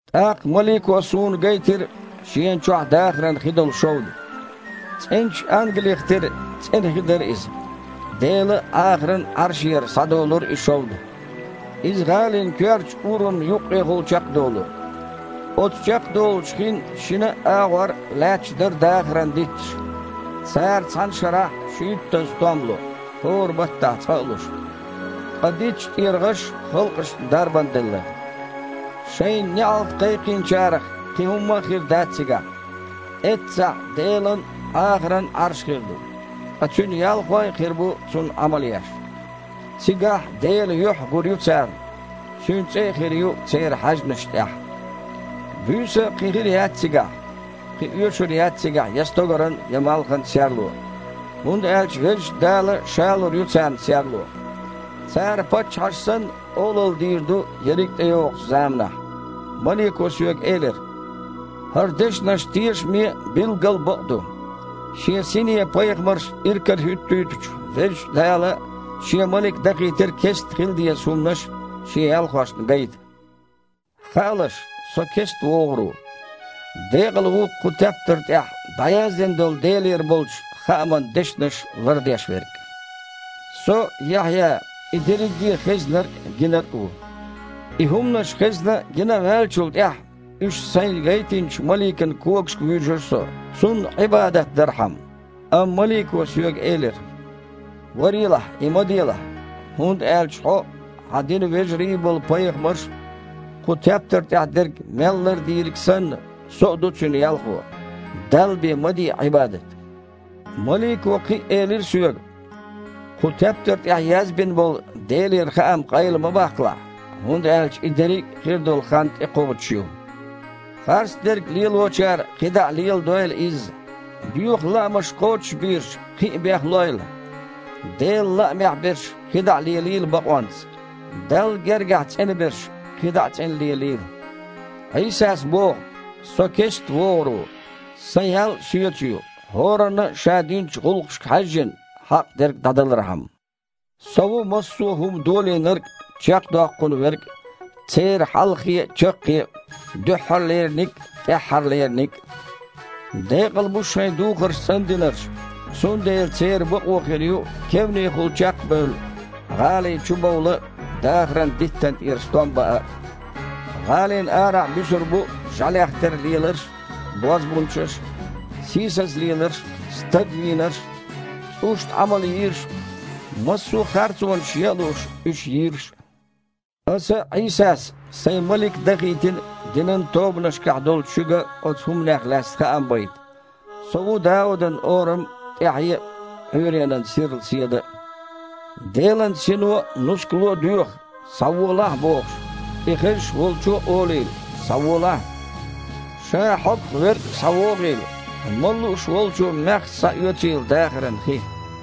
ТІаккха малико суна гайтира шена чохь дахаран хи долу шовда. ЦІеначу ангалих тера цІена хи дара иза. Делан а, Іахаран а Іаршера схьадолура и шовда. Иза гІалин коьртачу урамна юккъехула чекхдолура. Оцу чекхдолучу хин шинна а агІор лаьтташ дара дахаран дитташ. Цара цхьана шарахь шуьйттазза стом ло – хІора баттахь цкъа а луш. Ткъа дитташ тІера гІаш халкъашна дарбана делла. Шайна неІалт кхайкхийнчарах кхин хІумма а хир дац цигахь. Эццахь Делан а, Іахаран а Іарш хир ду, ткъа Цуьнан ялхой а хир бу Цунна Іамал еш. Цигахь Делан юьхь а гур ю царна. Цуьнан цІе а хир ю церан хьаьжнашна тІехь. Буьйса а кхин хир яц цигахь. Кхин оьшур яц цигахь я стогаран, я малхан серло, хІунда аьлча Везачу Дала Ша лур ю царна серло. Цара, паччахьаша санна, олалла дийр ду ерриг а тІейогІучу заманахь. Малико соьга элира: «ХІара дешнаш тешаме а, билггал бакъ а ду. Шен Сине пайхамарш иракарахІуьттуьйтучу Везачу Дала Шен малик дахийтира кестта хила деза хІуманаш Шен ялхошна гайта». «Хаалаш, Со кестта вогІур ву. Декъала ву кху тептар тІехь дІаяздина долу Делера болчу хааман дешнаш лардеш верг!» Со, Яхьъя, и дерриге а хезнарг а, гинарг а ву. И хІуманаш хезна а, гина а ваьллачул тІаьхьа, уьш сайна гайтинчу маликан когашка вуьйжира со, цунна Іибадат дархьама. Амма малико соьга элира: «Варелахь, и ма делахь, хІунда аьлча хьо а, хьан динан вежарий болу пайхамарш а, кху тептар тІехь дерг мел лардийриг а санна, со а ду Цуьнан ялхо. Далла бен ма де Іибадат!» Малико кхин а элира соьга: «Кху тептар тІехь язбина болу Делера хаам къайла ма баккхалахь, хІунда аьлча и дерриг а хир долу хан тІекхочуш ю. Харцдерг лелочара кхидІа а леладойла изза. Боьха лаамаш кхочушбийраш кхин а бехлойла. Делан лаамехь берш кхидІа а лелийла бакъонца. Далла гергахь цІена берш кхидІа а цІена лелийла». Іийсас боху: «Со кестта вогІур ву. Сан ял а Соьца ю, хІоранна а, ша динчу гІуллакхашка хьаьжжина, хьакъ дерг дІадалархьама. Со ву массо а хІума Долийнарг а, чекхдоккхун Верг а, церан Хьалхе а, Чаккхе а, Дуьххьарлераниг а, ТІаьххьарлераниг а». Декъала бу шайн духарш цІандинарш. Цундела церан бакъо хир ю, кевнехула чекх а бевлла, гІалин чу бовла а, дахаран диттана тІера стом баа а. ГІалина арахь буьсур бу жІаьлех тера леларш а, бозбунчаш а, сийсаза леларш а, стаг вийнарш а, цІушна Іамал йийраш а, массо а харцонаш ян а лууш, уьш йийраш. «Аса, Іийсас, Сайн малик дахийтина динан тобанашкахь долчу шуьга оцу хІуманех лаьцна хаам байта. Со ву Даудан Орам а, ТІаьхье а, Іуьйренан сирла Седа а». Делан Сино а, нускало а доьху: «Схьаволахь!» – бохуш. И хезаш волчо а олийла: «Схьаволахь!» Ша хьогах верг а схьавогІийла! Мала лууш волчо маьхза схьаоьцийла дахаран хи.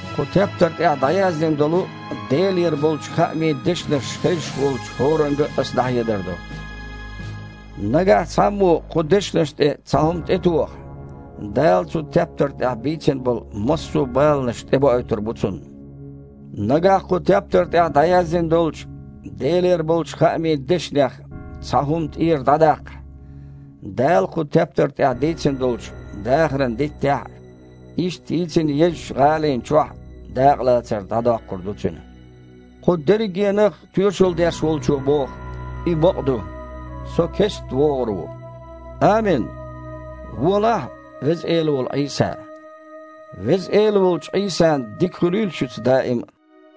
Кху тептар тІехь дІаяздина долу Делера болчу хаамийн дешнаш хезаш волчу хІоранга а Аса дІахьедар до: «Нагахь цхьаммо кху дешнашна тІе цхьа хІума тІетохахь, Дала цу тептар тІехь бийцина болу массо а баланаш тІебоуьйтур бу цунна. Нагахь кху тептар тІехь дІаяздина долчу Делера болчу хаамийн дешнех цхьа хІума тІера дІадаккхахь, Дала кху тептар тІехь дийцина долчу дахаран диттехь а, иштта йийцинчу езачу гІалина чохь а дакъалацар дІадоккхур ду цуьнан». Кху дерригенах а тоьшалла деш Волчо боху: «И бакъ ду, Со кестта вогІур ву». Амин. Волахьа, Веза Эла волу Іийса! Веза Эла волчу Іийсан дика хуьлийла шуьца даим а.